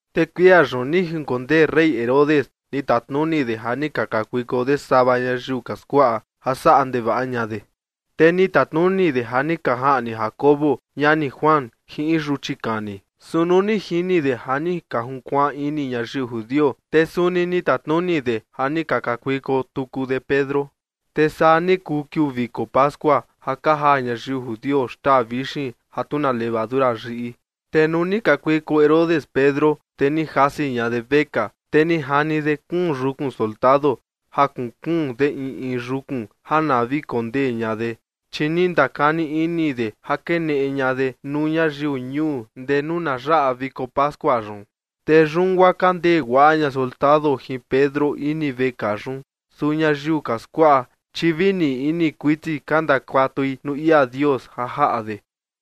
Te kuia yun ni jinkondee rey Herodes ni tatnuni de ja ni ka kakuiko de sava ñayiu ka skuaꞌa ja saꞌa ndevaꞌa ña de. Te ni tatnuni de ja ni ka jaꞌni Jacobo, ñani Juan, jin in yuchi kani. Su nuu ni jini de ja ni ka junkuaan ini ñayiu judio, te suni ni tatnuni de ja ni ka kakuiko tuku de Pedro. Te saa ni kuu kiuu viko pascua ja ka jaa ñayiu judio xtaa vixin ja tu na levadura yiꞌi. Te nuu ni kakuiko Herodes Pedro, te ni jasi ña de vekaa. Te ni jani de kuun yukun soldado ja kuun kuun de in in yukun ja na vi kondee ña de, chi ni ndakani ini de ja keneꞌe ña de nuu ñayiu ñuu ndee nuu na yaꞌa viko pascua yun. Te yun guaa ka ndee guaꞌa ña soldado jin Pedro ini vekaa yun, su ñayiu ka skuaꞌa, chi vi ni ini kuiti ka ndakuatui nuu ia Dios ja jaꞌa de.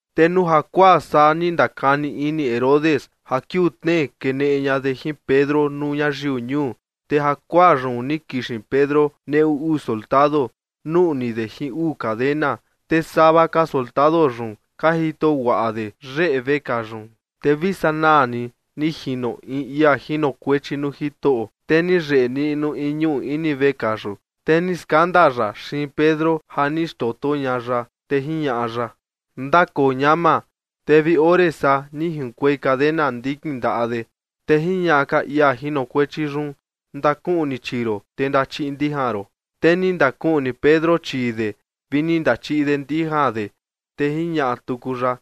Te nuu jakuaa saa ni ndakani ini Herodes ja kiuu tnee keneꞌe ña de jin Pedro nuu ñayiu ñuu. Te jakuaa yun ni kixin Pedro neꞌu uu soldado nuꞌni de jin uu cadena, te sava ka soldado yun ka jito guaꞌa de yeꞌe vekaa yun. Te vi sanaa ni ni jino in ia jinokuechi nuu Jitoꞌo, te ni yeꞌe niꞌnu in ñuꞌu ini vekaa yun, te ni skanda ya xiin Pedro ja ni xndoto ña ya, te jiñaꞌa ya: ―Ndakoo ñama. Te vi ore saa ni junkuei cadena ndikin ndaꞌa de. Te jiñaꞌa ka ia jinokuechi yun: ―Ndakuꞌni chii ron, te ndachiꞌi ndijan ron. Te ni ndakuꞌni Pedro chii de vi ni ndachiꞌi de ndijan de. Te jiñaꞌa tuku ya: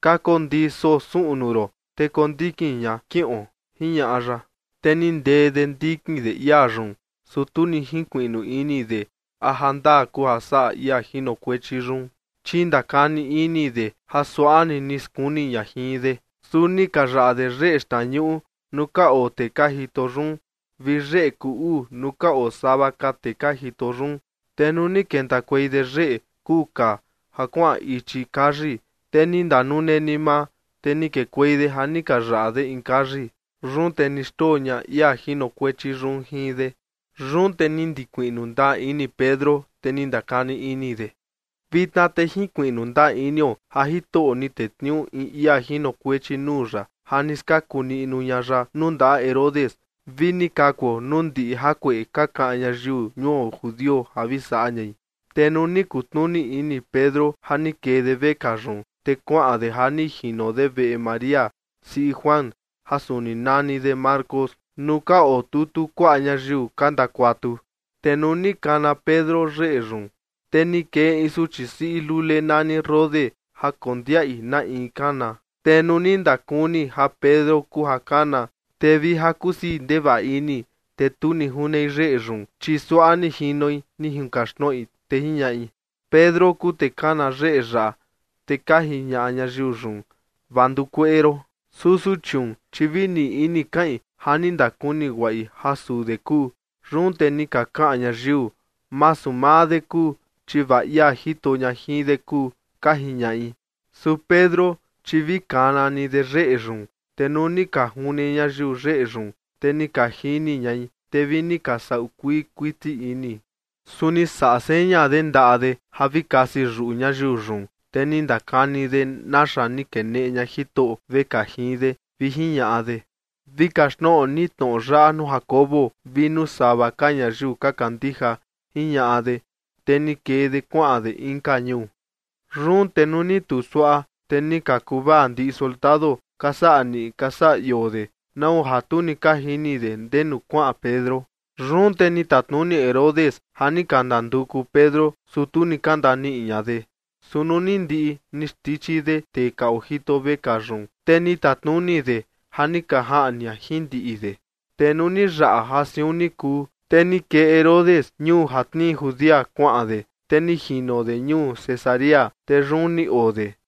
―Kakondii soo suꞌnu ron, te kondikin ña, kiꞌon ―jiñaꞌa ya. Te ni ndee de ndikin de ia yun, su tu ni jinkuiꞌnu ini de a jandaa kuu ja saꞌa ia jinokuechi yun, chi ndakani ini de ja suaꞌa ni ni skuni ña jin de. Su ni ka yaꞌa de yeꞌe xtnañuꞌu nuu ka oo tee ka jito yun vi yeꞌe kuu uu nuu ka oo sava ka tee ka jito yun, te nuu ni kentakuei de yeꞌe kuu kaa ja kuaꞌan ichi kayi, te ni ndanune ni maa, te ni kekuei de ja ni ka yaꞌa de in kayi. Yun te ni xndoo ña ia jinokuechi yun jin de. Yun te ni ndikuiꞌnu ndaa ini Pedro, te ni ndakani ini de: ―Vitna te jinkuiꞌnu ndaa inio ja Jitoꞌo ni tetniuu in ia jinokuechi nuu ya ja ni skaku niꞌnu ña ya nuu ndaꞌa Herodes vi ni kakuo nuu ndiꞌi jakueꞌe ka kaꞌan ñayiu ñuo judio ja vi saꞌa ñai. Te nuu ni kutnuni ini Pedro ja ni kee de vekaa yun, te kuaꞌan de ja ni jino de veꞌe María, siꞌi Juan, ja suni nani de Marcos, nuu ka otutu kuaꞌa ñayiu ka ndakuatu. Te nuu ni kana Pedro yeꞌe yun, te ni kee in suchi siꞌi lule nani Rode ja kondiaꞌi na in kana. Te nuu ni ndakuni ja Pedro kuu ja kana, te vi ja kusii ndevaꞌa ini. Te tu ni junei yeꞌe yun, chi suaꞌa ni jinoi ni junkaxtnoꞌi, te jiñaꞌi: ―Pedro kuu tee kana yeꞌe yaꞌa. Te ka jiñaꞌa ñayiu yun: ―Vaa nduu kueꞌe ron. Su suchiun, chi vi ni ini kaꞌin ja ni ndakuni guaꞌi ja suu de kuu. Yun te ni ka kaꞌan ñayiu: ―Masu maa de kuu, chi vaa ia jito ña jin de kuu ―ka jiñaꞌi. Su Pedro, chi vi kana ni de yeꞌe yun, te nuu ni ka june ñayiu yeꞌe yun, te ni ka jini ñai, te vi ni ka saꞌu kuii kuiti ini. Su ni saꞌa seña de ndaꞌa de ja vi kasi yuꞌu ñayiu yun, te ni ndakani de naxa ni keneꞌe ña Jitoꞌo vekaa jin de, vi jiñaꞌa de: ―Vi kaxtnoꞌo ni tnoꞌo yaꞌa nuu Jacobo vi nuu sava ka ñayiu ka kandija ―jiñaꞌa de. Te ni kee de kuaꞌan de inka ñuu. Yun te nuu ni tuu suaꞌa, te ni ka kuvaa ndiꞌi soldado ka saꞌa niꞌi ka saꞌa ioo de, nau ja tu ni ka jini de ndenu kuaꞌan Pedro. Yun te ni tatnuni Herodes ja ni ka ndanduku Pedro, su tu ni ka ndaniꞌi ña de. Su nuu ni ndiꞌi ni xndichi de tee ka ojito vekaa yun, te ni tatnuni de ja ni ka jaꞌni ña jin ndiꞌi de. Te nuu ni yaꞌa ja siun ni kuu, te ni kee Herodes ñuu ja tnii Judea kuaꞌan de, te ni jino de ñuu Cesarea, te yun ni oo de.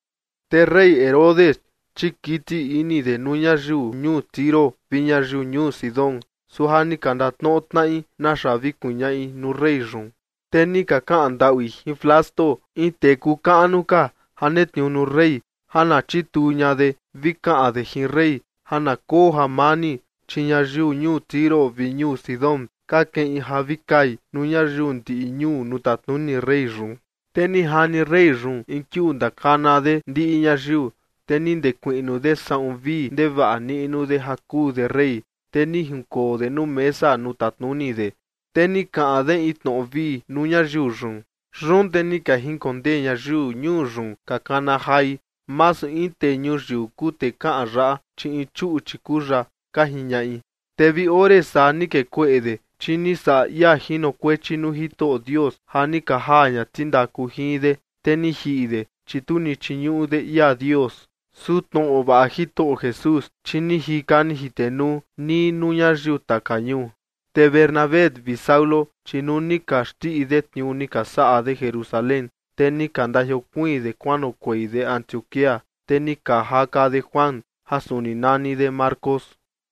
Te rey Herodes, chi kiti ini de nuu ñayiu ñuu Tiro vi ñayiu ñuu Sidón, su ja ni ka ndatnoꞌo tnaꞌi naxa vi kuñaꞌi nuu rey yun. Te ni ka kaꞌan ndaꞌui jin Blasto, in tee kuu kaꞌnu ka ja netniuu nuu rey, ja na chituu ña de vi kaꞌan de jin rey ja na koo jamani, chi ñayiu ñuu Tiro vi ñuu Sidón ka keꞌin ja vi kai nuu ñayiu ndiꞌi ñuu nuu tatnuni rey yun. Te ni jani rey yun in kiuu ni ndakana de ndiꞌi ñayiu, te ni ndekuiꞌnu de saꞌun vii ndevaꞌa niꞌnu de ja kuu de rey, te ni jinkoo de nuu mesa nuu tatnuni de, te ni kaꞌan de in tnoꞌo vii nuu ñayiu yun. Yun te ni ka jinkondee ñayiu ñuu yun ka kana jai: ―Masu in tee ñuyiu kuu tee kaꞌan yaꞌa, chi in chuꞌchi kuu ya ―ka jiñaꞌi. Te vi ore saa ni kee kueꞌe de, chi ni saꞌa ia jinokuechi nuu Jitoꞌo Dios ja ni ka jaa ña tindaku jin de, te ni jiꞌi de, chi tu ni chiñuꞌu de ia Dios. Su tnoꞌo vaꞌa Jitoꞌo Jesús, chi ni jika ni jitenuu nii nuu ñayiu taka ñuu. Te Bernabé vi Saulo, chi nuu ni ka xndiꞌi de tniuu ni ka saꞌa de Jerusalén, te ni ka ndajiokuiin de kuanoꞌokuei de Antioquía, te ni ka jaka de Juan, ja suni nani de Marcos.